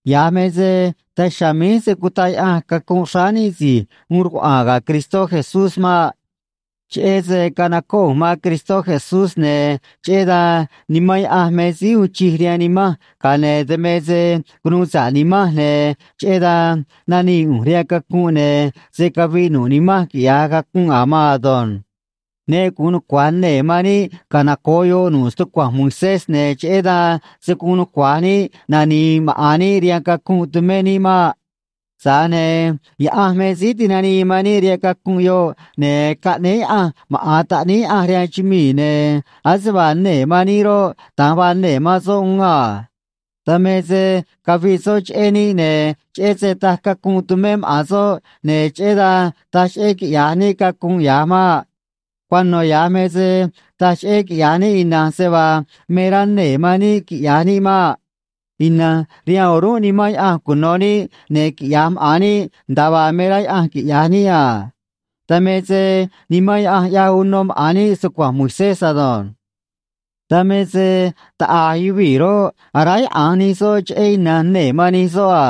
Ya̱j me se daj chiha̱a̱ míj se̱ cutaꞌ Yaꞌanj cacunꞌ xráá níꞌ si̱j uun rcuaꞌa̱a̱n ga̱ Cristó Jesús maꞌ. Cheꞌé se canocóꞌ ꞌu̱nj man Cristó Jesús, ne̱ cheꞌé dan Nimán Yaꞌanj me síí uun chij rihaan nimanj, ga̱a ne̱ dan me se cunuu sa̱ꞌ nimanj, ne̱ cheꞌé dan nanii ꞌu̱nj rihaan cacunꞌ, ne̱ se̱ caviꞌ nu̱ꞌ nimanj quiꞌya̱j cacunꞌ a̱ maan ado̱nj. Ne gu̱un nucua̱j nee̱ man níꞌ canoco̱ꞌ yoꞌ nu̱ꞌ stucua̱nj Moisés, ne̱ cheꞌé dan se̱ guun nucua̱j níꞌ nani̱i̱ maꞌa̱n níꞌ rihaan cacunꞌ tumé níꞌ maꞌ. Tza̱j ne̱ Yaꞌanj me síí tinanii man níꞌ rihaan cacunꞌ yoꞌ, ne̱ caꞌnéé Yaꞌanj maꞌa̱n Taꞌníí Yaꞌanj rihaan chumii̱, ne̱ ase vaa nee̱ man níꞌ roꞌ, da̱nj vaa nee̱ man soꞌ uún a. Dan me se caviꞌ soꞌ cheꞌé níꞌ, ne̱ cheꞌé se taj cacunꞌ tumé maꞌa̱n soꞌ, ne̱ cheꞌé dan taj cheꞌé quiꞌya̱j níꞌ cacunꞌ ya̱j maꞌ. Cuano̱ ya̱j me se taj cheꞌé quiꞌya̱j níꞌ ina̱nj se vaa me rá nee̱ man níꞌ quiꞌya̱j níꞌ maꞌ. Ina̱nj rihaan o̱rúnꞌ Nimán Yaꞌanj cuno̱ níꞌ, ne̱ quiꞌya̱j maꞌa̱n níꞌ nda̱a vaa me rá Yaꞌanj quiꞌya̱j níꞌ a. Dan me se Nimán Yaꞌanj ꞌyaj uno maꞌa̱n níꞌ stucua̱nj Moisés ado̱nj. Dan me se taꞌa̱j yuvii̱ roꞌ, aráyaꞌa̱nj nij soꞌ cheꞌé ina̱nj nee̱ man nij soꞌ a.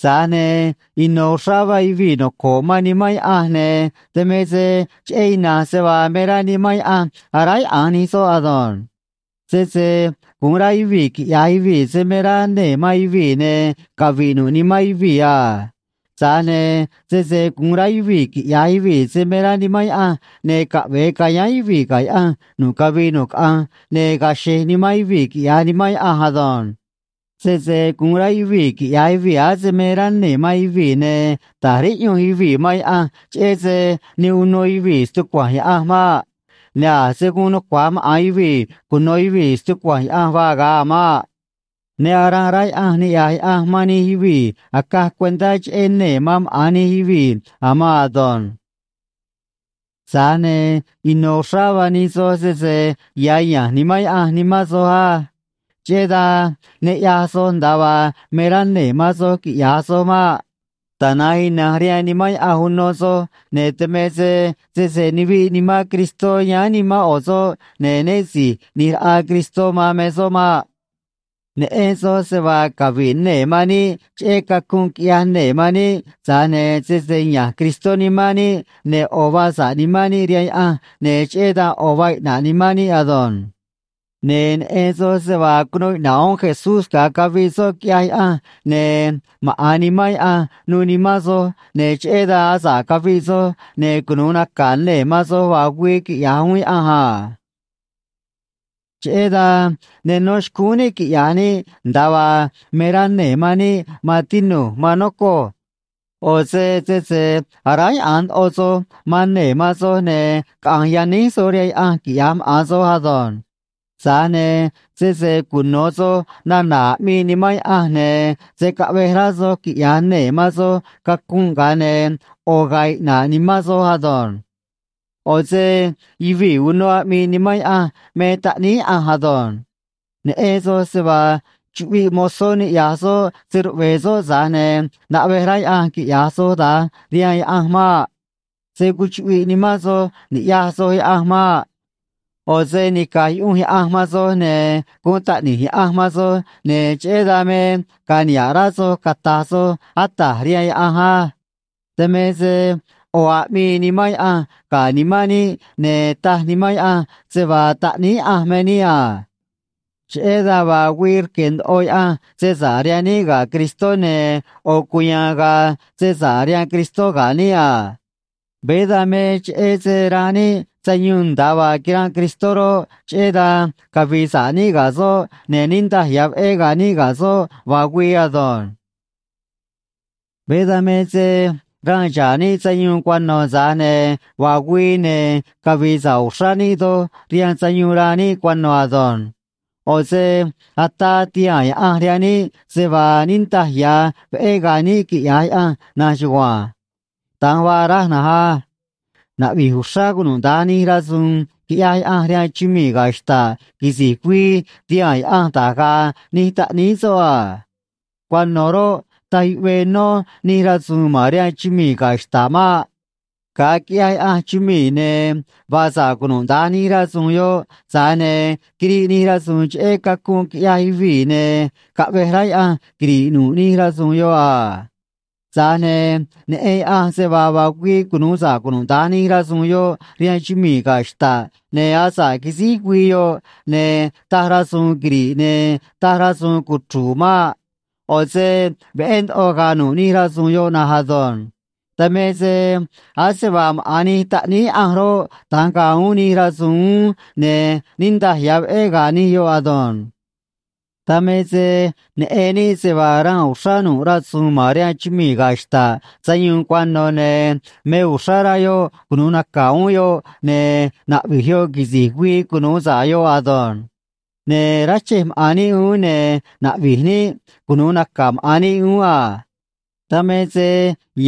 Tza̱j ne̱ ino̱ uxrá vaa yuvii̱ noco̱ꞌ man Nimán Yaꞌanj, ne̱ dan me se cheꞌé ina̱nj se vaa me rá Nimán Yaꞌanj aráyaꞌa̱nj nij soꞌ ado̱nj. Sese gu̱un rá yuvii̱ quiꞌya̱j yuvii̱ se me rá nee̱ man yuvii̱, ne̱ cavi̱ꞌ nu̱ꞌ nimán yuvii̱ a. Tza̱j ne̱ sese gu̱un rá yuvii̱ quiꞌya̱j yuvii̱ se me rá Nimán Yaꞌanj, ne̱ caꞌve̱e ca̱yáán yuvii̱ ga̱ Yaꞌanj nu̱ꞌ cavii nu̱ꞌ caꞌanj, ne̱ ga̱a̱ xe̱j nimán yuvii̱, quiꞌya̱j Nimán Yaꞌanj ado̱nj. Sese gu̱un rá yuvii̱ quiꞌya̱j yuvii̱ ase me rá nee̱ man yuvii̱, ne̱ ta̱j riꞌyunj yuvii̱ man Yaꞌanj, cheꞌé se ne uno yuvii̱ stucua̱nj Yaꞌanj maꞌ. Ne̱ a̱ se̱ guun nucua̱j maꞌa̱n yuvii̱ cuno̱ yuvii̱ stucua̱nj Yaꞌanj vaa ga̱a a̱ maꞌ. Ne aranꞌ rá Yaꞌanj niꞌya̱j Yaꞌanj man nij yuvii̱ acaj cuentá cheꞌé nee̱ man maꞌa̱n nij yuvii̱ a̱ maan ado̱nj. Tza̱j ne̱ ino̱ uxrá vaa nij soj sese ya̱ ya̱nj Nimán Yaꞌanj nimán soj á. Cheꞌé dan ne ꞌyaj soj nda̱a vaa me rá nee̱ man soj quiꞌya̱j soj maꞌ. Tana̱nj ina̱nj rihaan Nimán Yaꞌanj uno soj, ne̱ dan me se sese nuviꞌ Nimán Cristó yáán nimán ꞌo̱ soꞌ, ne̱ né si̱j ꞌni̱j raꞌa Cristó man me soꞌ maꞌ. Neꞌen soj se vaa cavi̱ꞌ nee̱ man níꞌ cheꞌé cacunꞌ quiꞌyaj nee̱ man níꞌ, tza̱j ne̱ sese ya̱nj Cristó nimán níꞌ, ne̱ ꞌo̱ vaa sa̱ꞌ nimán níꞌ rihaan Yaꞌanj, ne̱ cheꞌé dan ꞌo̱ vaa iꞌna̱ꞌ nimán níꞌ ado̱nj. Ne̱ neꞌen soj se vaa cunuu iꞌna̱ꞌ uún Jesús ga̱a caviꞌ soꞌ, quiꞌyaj Yaꞌanj, ne̱ maꞌa̱n Nimán Yaꞌanj nuû nimán soj, ne̱ cheꞌé dan asa̱ꞌ caviꞌ soj, ne̱ cunu̱u naca̱ nee̱ man soj vaa güii, quiꞌya̱j uún Yaꞌanj a. Cheꞌé dan ne nó xcúún níꞌ quiꞌya̱j níꞌ nda̱a vaa me rá nee̱ man níꞌ, maan tinu̱j, maan nocoj. ꞌO̱ se sese aráyaꞌa̱nj ndoꞌo soj man nee̱ man soj, ne̱ caꞌa̱nj yaníj soj rihaan Yaꞌanj, quiꞌya̱j maꞌa̱n soj ado̱nj. Tza̱j ne̱ sese cuno̱ soj nana̱ aꞌmii Nimán Yaꞌanj, ne̱ se̱ caꞌvej rá soj quiꞌya̱j nee̱ man soj cacunꞌ, ga̱a ne̱ ꞌo̱ ga̱a̱ iꞌna̱ꞌ nimán soj ado̱nj. ꞌO̱ se yuvii̱ uno aꞌmii Nimán Yaꞌanj me taꞌníí Yaꞌanj ado̱nj. Neꞌen soj se vaa chuꞌviꞌ mozó niꞌya̱j soꞌ se‑ruꞌve̱e̱ soꞌ, tza̱j ne̱ naꞌvej rá Yaꞌanj quiꞌya̱j soj da̱nj rihaan Yaꞌanj maꞌ. Se̱ cuchuꞌviꞌ nimán soj ni̱ꞌyaj soj Yaꞌanj maꞌ. ꞌO̱ se nica̱j yuꞌunj Yaꞌanj man soj, ne̱ guun taꞌni̱j Yaꞌanj man soj, ne̱ cheꞌé dan me ga̱a̱ niha̱ꞌ rá soj cata̱j soj “Ata̱j” rihaan Yaꞌanj á. Dan me se ꞌo̱ aꞌmii Nimán Yaꞌanj ga̱ nimán níꞌ, ne̱ taj Nimán Yaꞌanj se vaa taꞌníí Yaꞌanj me níꞌ a. Cheꞌé dan vaa güii rque̱ ndoꞌo Yaꞌanj se sa̱ꞌ rihaan níꞌ ga̱ Cristó, ne̱ ꞌo̱ cuya̱a̱n ga̱a̱ se sa̱ꞌ rihaan Cristó ga̱ níꞌ a. Veé dan me cheꞌé se ranꞌ níꞌ sayuun nda̱a vaa quiranꞌ Cristó roꞌ, cheꞌé dan cavi̱i̱ sa̱ꞌ níꞌ ga̱ soꞌ, ne̱ niꞌndaj ya̱ veꞌé ga̱a̱ níꞌ ga̱ soꞌ vaa güii ado̱nj. Veé dan me se ranꞌ xa̱ꞌ níꞌ sayuun cuano̱, tza̱j ne̱ vaa güii, ne̱ cavi̱i̱ sa̱ꞌ uxrá níꞌ doj rihaan sayuun ranꞌ níꞌ cuano̱ ado̱nj. ꞌO̱ se ataa ti̱haa̱n Yaꞌanj rihaan níꞌ se vaa niꞌndaj ya̱ veꞌé ga̱a̱ níꞌ, quiꞌya̱j Yaꞌanj na̱nj chugua̱nj. Da̱nj vaa raj na̱nj á. Naꞌvi̱j uxrá cunuda̱nj nij rasu̱u̱n quiꞌyaj Yaꞌanj rihaan chumii̱ ga̱ xta̱ꞌ quisi̱j güii ti̱haa̱n Yaꞌanj da̱j ga̱a̱ nij taꞌníí soꞌ a. Cuano̱ roꞌ, taj yuꞌvee nó nij rasu̱u̱n ma̱n rihaan chumii̱ ga̱ xta̱ꞌ maꞌ. Ga̱a quiꞌyaj Yaꞌanj chumii̱, ne̱ vaa sa̱ꞌ cunuda̱nj nij rasu̱u̱n yoꞌ, tza̱j ne̱ quiriꞌ nij rasu̱u̱n cheꞌé cacunꞌ quiꞌyaj yuvii̱, ne̱ caꞌvej rá Yaꞌanj quiri̱ꞌ nu̱ꞌ nij rasu̱u̱n yoꞌ a. Tza̱j ne̱ neꞌen Yaꞌanj se vaa vaa güii cunu̱u sa̱ꞌ cunuda̱nj nij rasu̱u̱n yoꞌ rihaan chumii̱ ga̱ xta̱ꞌ, ne̱ asa̱ꞌ quisíj güii yoꞌ, ne̱ taj rasu̱u̱n quiri̱ꞌ ne̱ taj rasu̱u̱n cuchru̱u̱ maꞌ. ꞌO̱ se veꞌé ndoꞌo ga̱a̱ nu̱ꞌ nij rasu̱u̱n yoꞌ na̱nj ado̱nj. Dan me se ase vaa maꞌa̱n nij taꞌníí Yaꞌanj roꞌ, da̱nj ga̱a̱ uún nij rasu̱u̱n uún, ne̱ niꞌndaj ya̱ veꞌé ga̱a̱ nij yoꞌ ado̱nj. Dan me se neꞌen níꞌ se vaa ranꞌ uxrá nu̱ꞌ rasu̱u̱n ma̱n rihaan chumii̱ ga̱ xta̱ꞌ sayuun cuano̱, ne̱ me uxrá rá yoꞌ cunu̱u naca̱ uún yoꞌ, ne̱ naꞌvi̱j yoꞌ quisi̱j güii cunu̱u sa̱ꞌ yoꞌ ado̱nj. Ne̱ ráchej maꞌa̱n níꞌ uún, ne̱ naꞌvi̱j níꞌ cunu̱u naca̱ maꞌa̱n níꞌ uún a. Dan me se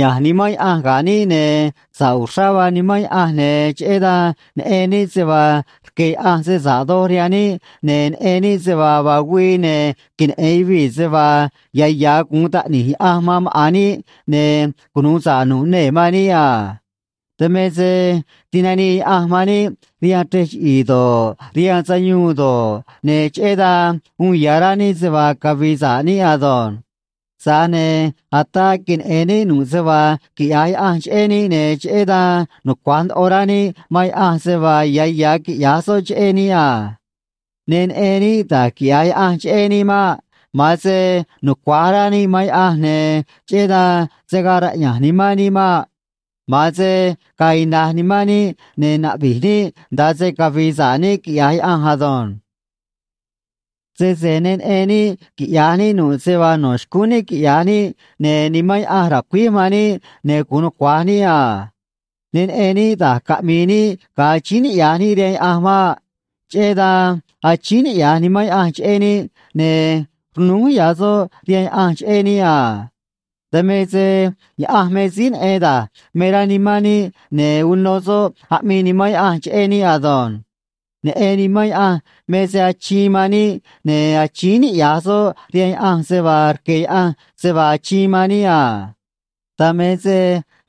ya̱nj Nimán Yaꞌanj ga̱ níꞌ, ne̱ sa̱ꞌ uxrá vaa Nimán Yaꞌanj, ne̱ cheꞌé dan neꞌen níꞌ se vaa rque̱ Yaꞌanj se sa̱ꞌ doj rihaan níꞌ, ne̱ neꞌen níꞌ se vaa vaa güii, ne̱ queneꞌe̱n yuvii̱ se vaa ya̱ ya̱ guun taꞌni̱j Yaꞌanj man maꞌa̱n níꞌ, ne̱ cunu̱u sa̱ꞌ nu̱ꞌ nee̱ man níꞌ a. Dan me se tinanii Yaꞌanj man níꞌ rihaan chrej chiꞌi̱i̱ do̱ꞌ, rihaan sayuun do̱ꞌ, ne̱ cheꞌé dan uun ya̱ rá níꞌ se vaa cavi̱i̱ sa̱ꞌ níꞌ ado̱nj. Tza̱j ne̱ ataa queneꞌe̱n níꞌ nu̱ꞌ se vaa quiꞌya̱j Yaꞌanj cheꞌé níꞌ, ne̱ cheꞌé dan nucua̱j ndoꞌo rá níꞌ man Yaꞌanj se vaa ya̱ ya̱ quiꞌya̱j soꞌ cheꞌé níꞌ a. Ne neꞌen níꞌ da̱j quiꞌya̱j Yaꞌanj cheꞌé níꞌ maꞌ. Ma̱an se nucua̱j rá níꞌ man Yaꞌanj, ne̱ cheꞌé dan se̱ gaa raꞌya̱nj nimán níꞌ maꞌ. Ma̱an se ga̱a̱ ina̱j nimán níꞌ, ne̱ na̱ꞌvi̱j níꞌ nda̱a se cavi̱i̱ sa̱ꞌ níꞌ quiꞌya̱j Yaꞌanj ado̱nj. Sese ne neꞌen níꞌ quiꞌya̱j níꞌ nu̱ꞌ se vaa no̱ xcúún níꞌ quiꞌya̱j níꞌ, ne̱ Nimán Yaꞌanj ra̱cuíj man níꞌ, ne̱ gu̱un nucua̱j níꞌ a. Ne neꞌen níꞌ da̱j caꞌmi̱i̱ níꞌ ga̱a achíín niꞌya̱j níꞌ rihaan Yaꞌanj maꞌ. Cheꞌé dan achíín niꞌya̱j Nimán Yaꞌanj cheꞌé níꞌ, ne̱ rnúj ya̱ soꞌ rihaan Yaꞌanj cheꞌé níꞌ a. Dan me se Yaꞌanj me síí neꞌen da̱j me rá nimán níꞌ, ne̱ uno soꞌ aꞌmii Nimán Yaꞌanj cheꞌé níꞌ ado̱nj. Neꞌen Nimán Yaꞌanj me se achiin man níꞌ, ne̱ achíín niꞌya̱j soꞌ rihaan Yaꞌanj se vaa rque̱ Yaꞌanj se vaa achiin man níꞌ a. Dan me se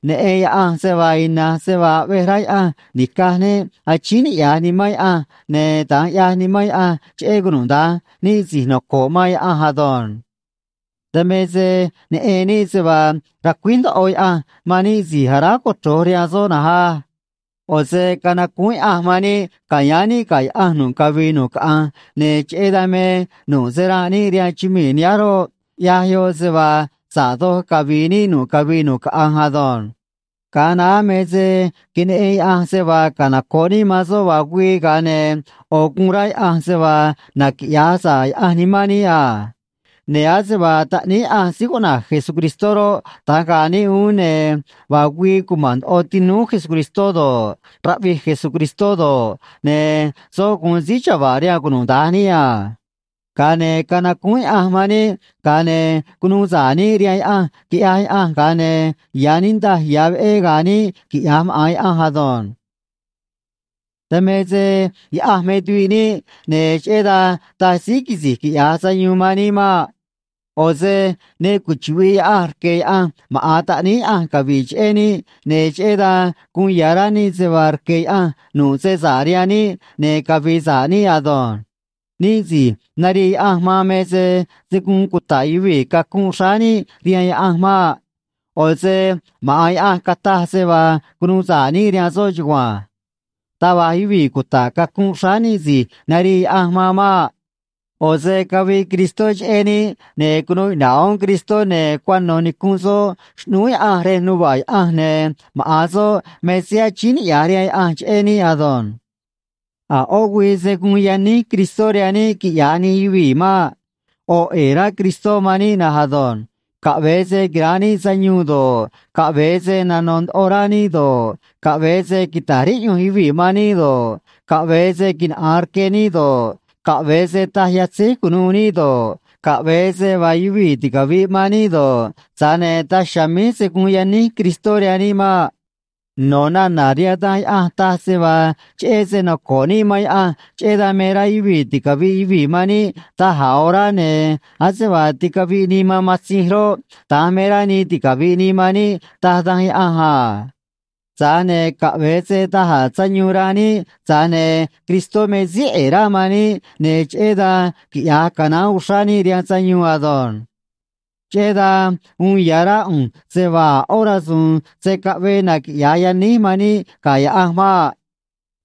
neꞌen Yaꞌanj se vaa ina̱nj se vaa aꞌvej rá Yaꞌanj ni̱caj níꞌ achíín niꞌya̱j Nimán Yaꞌanj, ne̱ da̱nj ꞌyaj Nimán Yaꞌanj cheꞌé cunuda̱nj níꞌ si̱j noco̱ꞌ man Yaꞌanj ado̱nj. Dan me se neꞌen níꞌ se vaa racuíj ndoꞌo Yaꞌanj man níꞌ si̱j aráj cochro̱j rihaan soꞌ na̱nj á. ꞌO̱ se canacúún Yaꞌanj man níꞌ ca̱yáán níꞌ ga̱ Yaꞌanj nu̱ꞌ cavii nu̱ꞌ caꞌanj, ne̱ cheꞌé dan me nu̱ꞌ se ranꞌ níꞌ rihaan chumii̱ nihánj roꞌ, ꞌyaj yoꞌ se vaa sa̱ꞌ doj cavi̱i̱ níꞌ nu̱ꞌ cavii nu̱ꞌ caꞌanj ado̱nj. Ga̱a naá me se queneꞌen Yaꞌanj se vaa canoco̱ꞌ níꞌ man soꞌ vaa güii, ga̱a ne̱ ꞌo̱ guun rá Yaꞌanj se vaa naquiꞌya̱j sa̱ꞌ Yaꞌanj nimán níꞌ a. Ne̱ ase vaa Taꞌníí Yaꞌanj síí cuꞌna̱j Jesucristó roꞌ, da̱nj ga̱a̱ níꞌ uún, ne̱ vaa güii cuma̱n ndoꞌo tinúú Jesucristó do̱ꞌ, raꞌvij Jesucristó do̱ꞌ, ne̱ soꞌ gu̱un síí chava̱ꞌ rihaan cunuda̱nj níꞌ a. Ga̱a ne̱ canacúún Yaꞌanj man níꞌ, ga̱a ne̱ cunuu sa̱ꞌ níꞌ rihaan Yaꞌanj, quiꞌyaj Yaꞌanj, ga̱a ne̱ ya̱ niꞌndaj ya̱ veꞌé ga̱a̱ níꞌ, quiꞌya̱j maꞌa̱n Yaꞌanj ado̱nj. Dan me se Yaꞌanj me tuviꞌ níꞌ, ne̱ cheꞌé dan taj síí quisi̱j quiꞌya̱j sayuun man níꞌ maꞌ. ꞌO̱ se ne cuchuꞌvi̱ꞌ Yaꞌanj rque̱ Yaꞌanj maꞌa̱n Taꞌníí Yaꞌanj cavi̱ꞌ cheꞌé níꞌ, ne̱ cheꞌé dan guun ya̱ rá níꞌ se vaa rque̱ Yaꞌanj nu̱ꞌ se sa̱ꞌ rihaan níꞌ, ne̱ cavi̱i̱ sa̱ꞌ níꞌ ado̱nj. Níꞌ si̱j narii Yaꞌanj man me se se̱ guun cuta̱ꞌ yuvii̱ cacunꞌ xráá níꞌ rihaan Yaꞌanj maꞌ. ꞌO̱ se maꞌa̱n Yaꞌanj cataj se vaa cunuu sa̱ꞌ níꞌ rihaan soꞌ chugua̱nj. Taj va̱j yuvii̱ cuta̱ꞌ cacunꞌ xráá níꞌ si̱j narii Yaꞌanj man maꞌ. ꞌO̱ se caviꞌ Cristó cheꞌé níꞌ, ne̱ cunuu iꞌna̱ꞌ uún Cristó, ne̱ cuano̱ nicunꞌ soꞌ xꞌnúú Yaꞌanj rej nuva̱ꞌ Yaꞌanj, ne̱ maꞌa̱n soꞌ me síí achíín niꞌya̱j rihaan Yaꞌanj cheꞌé níꞌ ado̱nj. A̱ ꞌó güii se̱ guun yaníj Cristó rihaan níꞌ, quiꞌya̱j nij yuvii̱ maꞌ. ꞌO̱ ꞌe̱e̱ rá Cristó man níꞌ na̱nj ado̱nj. Caꞌve̱e se quira̱nꞌ níꞌ sayuun do̱ꞌ, caꞌve̱e se nano̱ ndoꞌo rá níꞌ do̱ꞌ, caꞌve̱e se quita̱j riꞌyunj yuvii̱ man níꞌ do̱ꞌ, caꞌve̱e se quinaꞌa̱an rque níꞌ do̱ꞌ, caꞌve̱e se taj yatzéj cu̱nuû níꞌ do̱ꞌ, caꞌve̱e se vaa yuvii̱ ticavi̱ꞌ man níꞌ do̱ꞌ, tza̱j ne̱ daj chiha̱a̱ míj se̱ guun yaníj Cristó rihaan níꞌ maꞌ. No̱ nana̱ rihaan Danj Yaꞌanj taj se vaa cheꞌé se noco̱ꞌ níꞌ man Yaꞌanj, cheꞌé dan me rá yuvii̱ ticavi̱ꞌ yuvii̱ man níꞌ da̱j a̱ orá, ne̱ ase vaa ticaviꞌ nii man matzinj roꞌ, da̱nj me rá nii ticavi̱ꞌ nii man níꞌ, taj Danj Yaꞌanj a. Tza̱j ne̱ caꞌve̱e se da̱j a̱ sayuun ranꞌ níꞌ, tza̱j ne̱ Cristó me síí ꞌe̱e̱ rá man níꞌ, ne̱ cheꞌé dan quiꞌya̱j canaán uxrá níꞌ rihaan sayuun ado̱nj. Cheꞌé dan uun ya̱ rá ꞌu̱nj se vaa a̱ ꞌó rasu̱u̱n se̱ caꞌvee naquiꞌya̱j yaníj man níꞌ ga̱ Yaꞌanj maꞌ.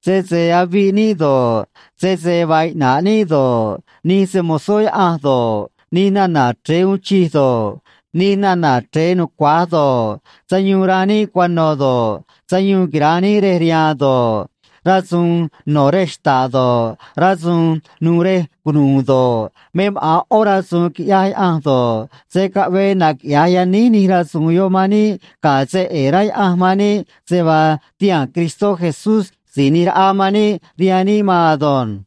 Sese aviꞌ níꞌ do̱ꞌ, sese vaa iꞌna̱ꞌ níꞌ do̱ꞌ, nij se‑mo̱zó Yaꞌanj do̱ꞌ, nij nana̱ chre̱e uun chij do̱ꞌ, nij nana̱ chre̱e nucua̱j do̱ꞌ, sayuun ranꞌ níꞌ cuano̱ do̱ꞌ, sayuun quira̱nꞌ níꞌ rej riha̱a̱n do̱ꞌ, rasu̱u̱n no̱ rej xta̱ꞌ do̱ꞌ, rasu̱u̱n nu̱u̱ rej cunu̱u̱ do̱ꞌ, me maꞌa̱n ꞌó rasu̱u̱n quiꞌyaj Yaꞌanj do̱ꞌ, se̱ caꞌvee naquiꞌya̱j yaníj nij rasu̱u̱n yoꞌ man níꞌ ga̱ se ꞌe̱e̱ rá Yaꞌanj man níꞌ se vaa tihaa̱n Cristó Jesús Si̱j ꞌNi̱j Raꞌa man níꞌ rihaan níꞌ maan ado̱nj.